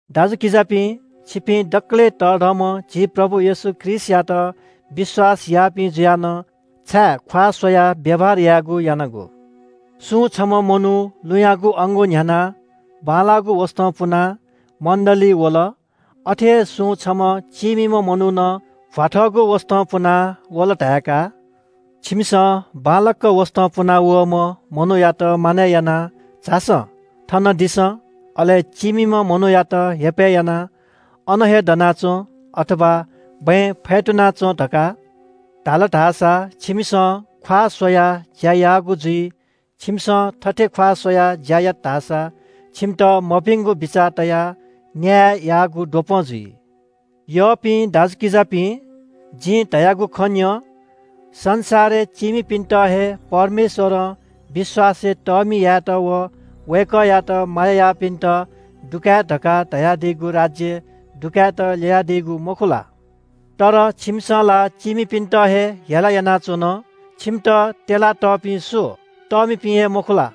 दाजुकिजापिं, छिपिं दकलय् तःधंम्‍ह झी प्रभु येशू ख्रीष्‍टयात विश्‍वास याःपिं जुया नं छाय् ख्‍वाः स्‍वयाः व्‍यवहार यायेगु यानागु? सुं छम्‍ह मनू लुँयागु अंगू न्‍ह्यानाः बांलाःगु वसतं पुनाः मण्‍डलीइ वल, अथे हे सुं छम्‍ह चीमिम्‍ह मनू नं भ्‍वाथःगु वसतं पुनाः वल धाय्‌का। छिमिसं बांलाक वसतं पुनावःम्‍ह मनूयात मानय् यानाः “झासँ, थन दिसँ,” अले चीमिम्‍ह मनूयात हेपय् यानाः “अन हे दनाच्‍वँ, अथवा बँय् फ्‍यतुना च्‍वँ” धकाः धाल धाःसा छिमिसं ख्‍वाः स्‍वयाः ज्‍या याःगु जुइ। छिमिसं थथे ख्‍वाः स्‍वयाः ज्‍या यात धाःसा छिमित मभिंगु बिचाः तयाः न्‍याय याःगु द्वपं जुइ। यःपिं दाजुकिजापिं, जिं धयागु खँ न्‍यँ – संसारय् चीमिपिन्‍त हे परमेश्‍वरं विश्‍वासय् तःमि यायेत व वय्‌कःयात माया याःपिन्‍त दुकाये धकाः धयादीगु राज्‍यय् दुकायेत ल्‍ययादीगु मखु ला? तर छिमिसं ला चीमिपिन्‍त हे हेला यानाच्‍वन। छिमित त्‍यला तःपिं सु? तःमिपिं हे मखु ला?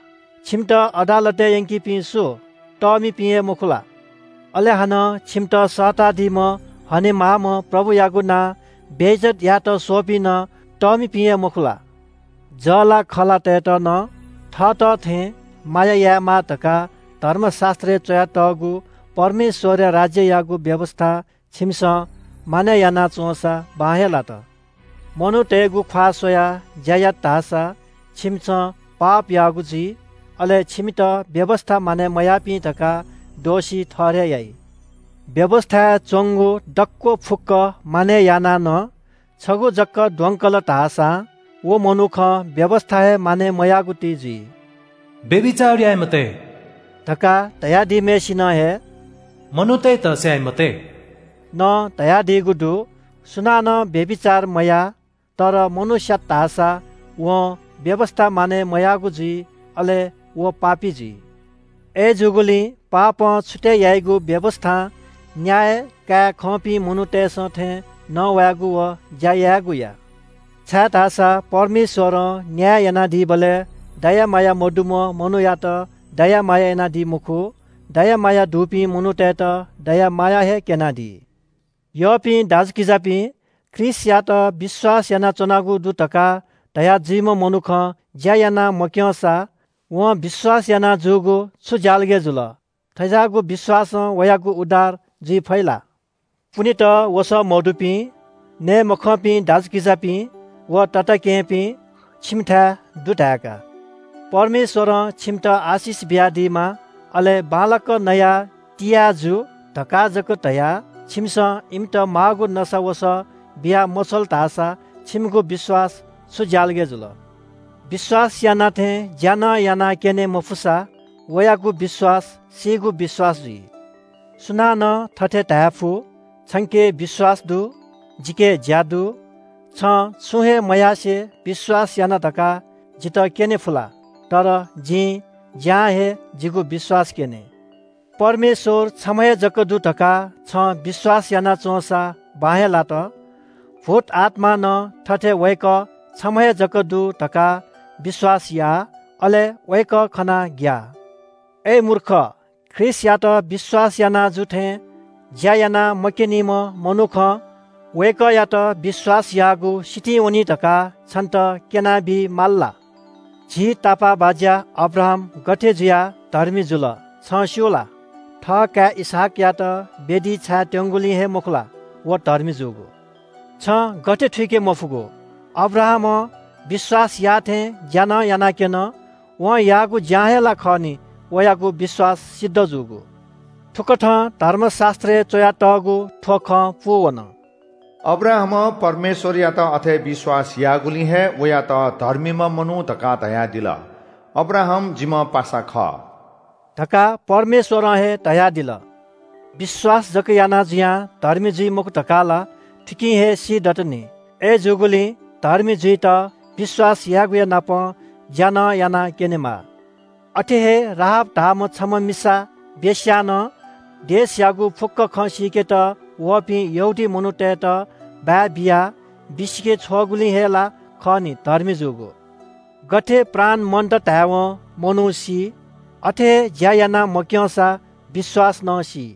छिमित अदालतय् यंकीपिं सु? तःमिपिं हे मखु ला? अले हानं छिमित सःतादीम्‍ह हनेमाःम्‍ह प्रभुयागु नां बेइज्‍जत यायेत स्‍वःपिं नं तःमिपिं हे मखु ला? जःलाखःलातय्‌त नं थःत थें माया यायेमाः धकाः धर्मशास्‍त्रय् च्‍वयातःगु परमेश्‍वरया राज्‍ययागु व्‍यवस्‍था छिमिसं मानय् याना च्‍वंसा बां हे लात। मनूतय्‌गु ख्‍वाः स्‍वयाः ज्‍या यात धाःसा छिमिसं पाप याःगु जुइ। अले छिमित व्‍यवस्‍था मानय् मयाःपिं धकाः दोषी ठहरय् याइ। व्‍यवस्‍थाय् च्‍वंगु दक्‍व फुक्‍क मानय् यानाः नं छगू जक द्वंकल धाःसां व मनुखं व्‍यवस्‍था हे मानय् मयाःगु ति जुइ। “व्‍यभिचार याये मते” धकाः धयादीम्‍हय्‌सिनं हे “मनूतय्‌त स्‍याये मते” नं धयादीगु दु। सुनानं व्‍यभिचार मयाः तर मनू स्‍यात धाःसा वं व्‍यवस्‍था मानय् मयाःगु जुइ, अले व पापी जुइ। अय्‌जूगुलिं पापं छुतय् याइगु व्‍यवस्‍थां न्‍याय काये खंपिं मनूतय्‌सं थें नवायेगु व ज्‍या यायेगु या। छाय्‌धाःसा परमेश्‍वरं न्‍याय यानादीबलय् दया माया मदुम्‍ह मनूयात दया माया यानादी मखु। दया माया दुपिं मनूतय्‌त दया माया हे क्‍यनादी। यःपिं दाजुकिजापिं, ख्रीष्‍टयात विश्‍वास यानाच्‍वनागु दु धकाः धया जुइम्‍ह मनुखं ज्‍या याना मक्‍यंसा, वं विश्‍वास याना जूगु छु ज्‍यालगय् जुल? थज्‍याःगु विश्‍वासं वयागु उद्धार जुइ फइ ला? पुनेत वसः मदुपिं, नये मखंपिं दाजुकिजापिं व तताकेहेँपिं छिमिथाय् दु धाय्‌का। “परमेश्‍वरं छिमित आशिष बियादीमा, अले बांलाक नया तिया जु” धकाः जक धयाः छिमिसं इमित माःगु नसा वसः बिया मछ्वल धाःसा छिमिगु विश्‍वास छु ज्‍यालगय् जुल? विश्‍वास याना थें ज्‍या नं यानाक्‍यने मफुसा वयागु विश्‍वास सीगु विश्‍वास जुइ। सुनानं थथे धायेफु – “छंके विश्‍वास दु, जिके ज्‍या दु।” छं छुं हे मयासें विश्‍वास याना धकाः जितः क्‍यनेफु ला? तर जिं ज्‍यां हे जिगु विश्‍वास क्‍यने। परमेश्‍वर छम्‍ह हे जक दु धकाः छं विश्‍वास याना च्‍वंसा, बां हे लात। भूतआत्‍मां नं थथे वय्‌कः छम्‍ह हे जक दु धकाः विश्‍वास याः, अले वय्‌कः खनाः ग्‍याः। अय् मूर्ख, ख्रीष्‍टयात विश्‍वास याना जू थें ज्‍या याना मक्‍यनीम्‍ह मनुखं वय्‌कःयात विश्‍वास याःगु सितिं वनी धकाः छन्‍त क्‍यनाबी माल ला? झी तापाःबाज्‍या अब्राहाम गथे जुयाः धर्मी जुल, छं स्‍यू ला? थःकाय् इसहाकयात वेदीइ छाये त्‍यंगुलिं हे मखु ला, व धर्मी जूगु? छं गथे थुइके मफुगु? अब्राहामं विश्‍वास याः थें ज्‍या नं यानाक्‍यन। वं याःगु ज्‍यां हे ला खः नि, वयागु विश्‍वास सिद्ध जूगु। थुकथं धर्मशास्‍त्रय् च्‍वयातःगु थ्‍व खँ पूवन – “अब्राहामं परमेश्‍वरयात अथे विश्‍वास याःगुलिं हे वयात धर्मीम्‍ह मनू धकाः धयादिल।” “अब्राहाम जिम्‍ह पासा खः” धकाः परमेश्‍वरं हे धयादिल। विश्‍वास जक याना जुयां धर्मी जुइ मखु धकाः ला थुकिं हे सीदत नि। अय्‌जूगुलिं धर्मी जुइत विश्‍वास यायेगुयानापं ज्‍या नं यानाः क्‍यनेमाः। अथे हे राहाब धाःम्‍ह छम्‍ह मिसा वेश्‍या नं देशयागु फुक्‍क खँ सीकेत वःपिं यहूदी मनूतय्‌त बाय् बियाः बिसिके छ्वःगुलिं हे ला खः नि धर्मी जूगु। गथे प्राण मन्‍त धायेवं मनू सी, अथे हे ज्‍या याना मक्‍यंसा विश्‍वास नं सी।